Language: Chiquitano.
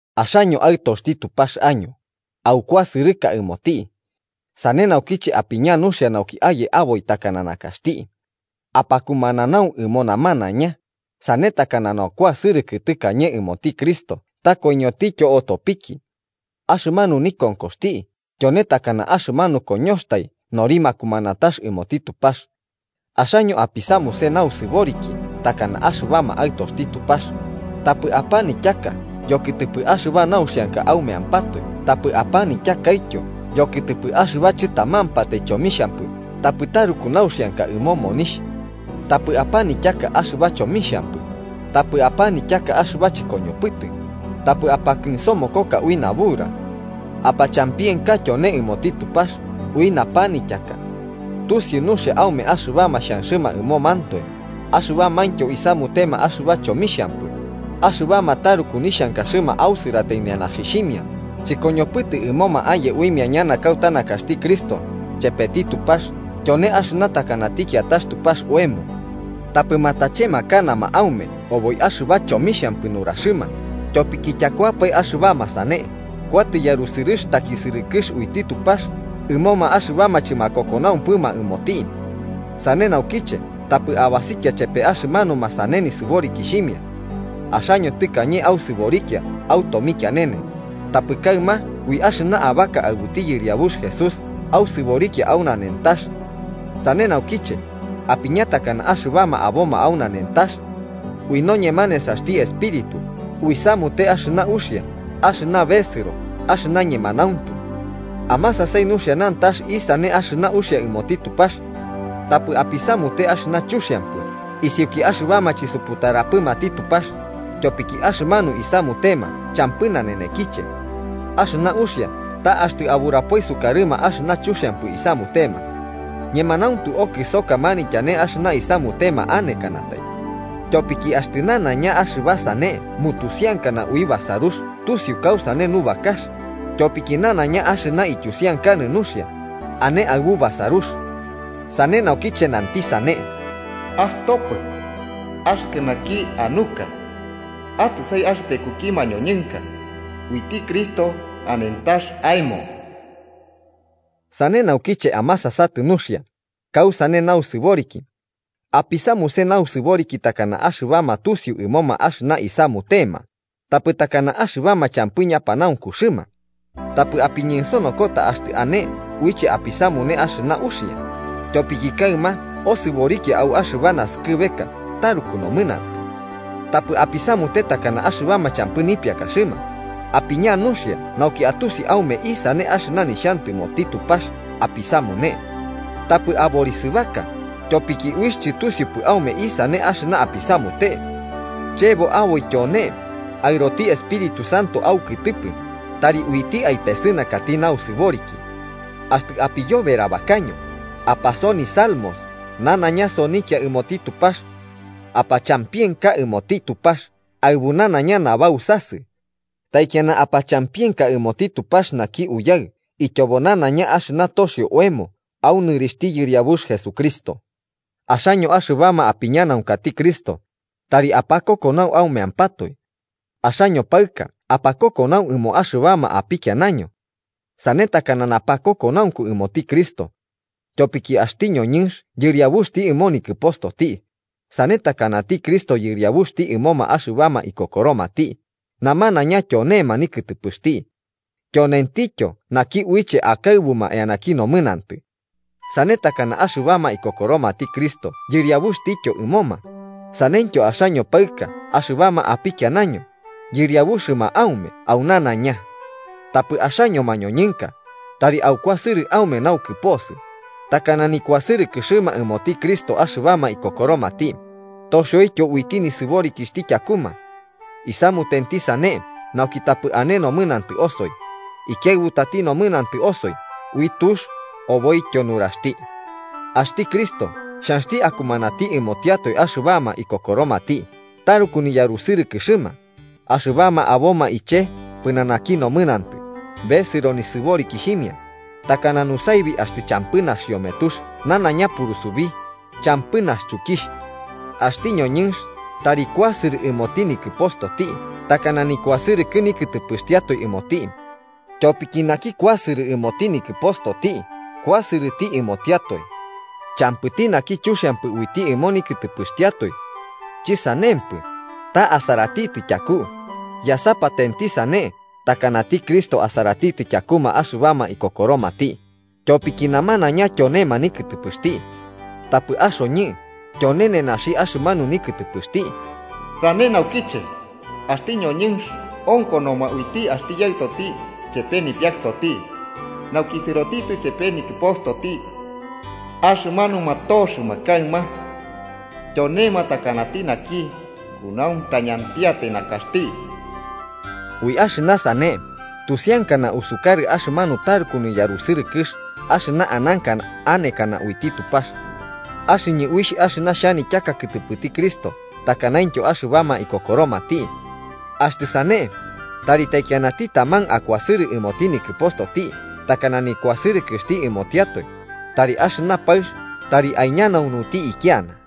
Axaño aɨtoxti Tupax año, aukuasɨrɨka ɨmoti. Sane naukiche apiña nuxia nauki aye aboi takana nakaxti. Apakumananau ɨmo namanaiña, sane takana nukuasɨrɨkɨ tɨkañe ɨmoti Cristo ta koiñotityo otopiki. Axɨmanu nikonkoxti tyone takana axɨmanu koñoxtai nori makumanatax ɨmoti Tupax. Axaño apisamuse nausɨboriki takana axɨbama aɨtoxti Tupax: tapɨ apanityaka yokɨtɨpɨ axɨba nauxianka aumeampatoe tapɨ apanityakaityo yokɨtɨpɨ axɨba chɨtamampatai chomixhampɨ tapɨ taruku nauxianka ɨmo monixh. Tapɨ apanityaka axɨba chomixhampɨ, tapɨ apanityaka axɨba chɨkoñopɨtɨ, tapɨ apakɨnsomokoka ui nabura. Apachampienka tyone ɨmoti Tupax ui napanityaka. Tusiu nuxia aume axɨbama xhanxɨma ɨmomantoe, axɨbamaintyo isamutema axɨba chomixhampɨ, axɨbama taruku nixhankaxɨma ausɨratai nenaxixhimia chɨkoñopɨtɨ ɨmoma aye uimia ñana kauta nakaxti Cristo chepeti Tupax (tyone axɨna takanati kiatax tupax oemo). Tapɨ matachemakanama aume oboi axɨba chomixhampɨ nuraxɨma, tyopiki tyakuapae axɨbama sane kuatɨ yarusɨrɨx takisɨrɨkɨx uiti Tupax ɨmoma axɨbama chɨmakokonaumpɨma ɨmoti. Sane naukiche tapɨ abasikia chepe axɨmanuma sane nisɨborikixhimia. Axaño tɨkañe ausɨborikia au tomikianene, tapɨ kaɨma ui axɨna abaka aɨbuti Yɨriabux Jesús ausɨborikia au nanentax. Sane naukiche apiña takana axɨbama aboma au nanentax. Ui noñema nesaxti Espíritu uisamute axɨna uxia axɨna besɨro axɨna ñemanauntu. Amasasai nuxia nantax isane axɨna uxia ɨmoti Tupax. Tapɨ apisamute axɨna chuxiampɨ isiuki axɨbama chisuputaramapɨti Tupax, tyopiki axɨmanu isamutema champɨ nanenekiche. Axɨna uxia ta axtɨ aburapoi sukarɨma axɨna chuxiampɨ isamutema. Ñemanauntu okɨsoka manityane axɨna isamutema anekanatai. Tyopiki axtɨ nanaiña axɨba sane mutusiankana ui basarux tusiu kausane nubakax, tyopiki nanaiña axɨna ityusiankanɨ nuxia, ane aɨbu basarux. Sane naukiche nantɨ sane: “Astopɨ, axɨkɨ naki anuka. Atɨsai axɨpekuki makoiñoka, uiti Cristo anentax aemo.” Sane naukiche amasasatɨ nuxia kausane nausɨboriki. Apisamuse nausɨboriki takana axɨbama tusiu ɨmoma axɨna isamutema, tapɨ takana axɨbama champɨ ñapanaunkuxɨma. Tapɨ apiñensonokota axtɨ ane uiche apisamune axɨna uxia, tyopiki kaɨma osɨborikia au axɨba naskɨbeka taruku nomɨnantɨ. Tapɨ apisamute takana axɨbama champɨ nipiakaxɨma, apiña nuxia nauki atusi aume isane axɨna nixhantɨmoti Tupax apisamune. Tapɨ aborisɨbaka, tyopiki uixh chɨtusiupɨ aume isane axɨna apisamute. Chebo aboi tyone, aɨroti Espíritu Santo aukɨtɨpɨ tari uiti aipesɨnakati nausɨboriki. Axtɨ apiyoberabakaño, apasoni salmos, nanaiña sonikia ɨmoti Tupax. ¡Apachampienka ɨmoti Tupax aɨbu nanaiña nabausasɨ! Taikiana apachampienka ɨmoti Tupax naki Uyaɨ ityobo nanaiña axɨna toxio oemo au nɨrixhti Yɨriabux Jesucristo. Axaño axɨbama apiñanaunkati Cristo, tari apakokonau aumeampatoe. Axaño paɨka apakokonau ɨmoma axɨbama apikianaño. Sane takana napakokonaunku ɨmoti Cristo. Tyopiki axti ñoñɨnx yɨriabuxti ɨmo nikɨpostoti, sane takanati Cristo Yɨriabuxti ɨmoma axɨbama ikokoromati, namanaiña tyonema nikɨtɨpɨxti. Tyonentityo naki uiche akaɨbuma eanaki nomɨnantɨ. Sane takana axɨbama ikokoromati Cristo Yɨriabuxtityo ɨmoma, saneityo axaño paɨka axɨbama apikianaño yɨriabuxɨma aume au nanaiña. Tapɨ axaño mañoñɨnka, tari aukuasɨrɨ aume naukɨposɨ, takana nikuasɨrɨkɨxɨma ɨmoti Cristo axɨbama ikokoromati, toxioityo uiti nisɨborikixhti tyakuma. Isamutenti sane nauki tapɨ ane nomɨnantɨ osoi, ikiaɨbutati nomɨnantɨ osoi ui tux oboityo nuraxti. Axti Cristo xhanxti akumanati ɨmotiatoe axɨbama ikokoromati taruku niyarusɨrɨkɨxɨma, axɨbama aboma iche pɨnanaki nomɨnantɨ besɨro nisɨborikixhimia, takana nusaibi axtɨ champɨ naxiometux nanaiña purusubi, champɨ naxchukixh. Axti ñoñɨnx tari kuasɨrɨ ɨmoti nikɨpostoti takana nikuasɨrɨkɨ nikɨtɨpɨxtiatoe ɨmoti. Tyopiki naki kuasɨrɨ ɨmoti nikɨpostoti kuasɨrɨti ɨmotiatoe. Champɨti naki chuxiampatai uiti ɨmo nikɨtɨpɨxtiatoe. Chɨsanempɨ, ta asaratitɨ tyaku, yasapatenti, sane takanati Cristo asaratitɨ tyakuma axɨbama ikokoromati, tyopiki namanaiña tyonema nikɨtɨpɨxti. Tapɨ axoñɨ tyone nenaxi axɨmanu nikɨtɨpɨxti. “Sane naukiche, axti ñoñɨnx onkonoma uiti axti yaɨtoti chepe nipiakɨtoti nauki sɨsioti chepe nikɨpostoti, axɨmanuma toxɨma kaɨma tyonema takanati naki kunauntañantiatai nakaxti.” Ui axɨna sane tusiankana usukarɨ axɨmanu taruku niyarusɨrɨkɨx axɨna ananka anekana uiti Tupax. Axɨñɨ uixh axɨna xhanityaka kɨtɨpɨti Cristo takanaintyo axɨbama ikokoromati. Axtɨ sane, tari taikianati taman akuasɨrɨ ɨmoti nikɨpostoti takana nikuasɨrɨkɨxti ɨmotiatoe, tari axɨna paɨx tari aiñanaunuti ikiana.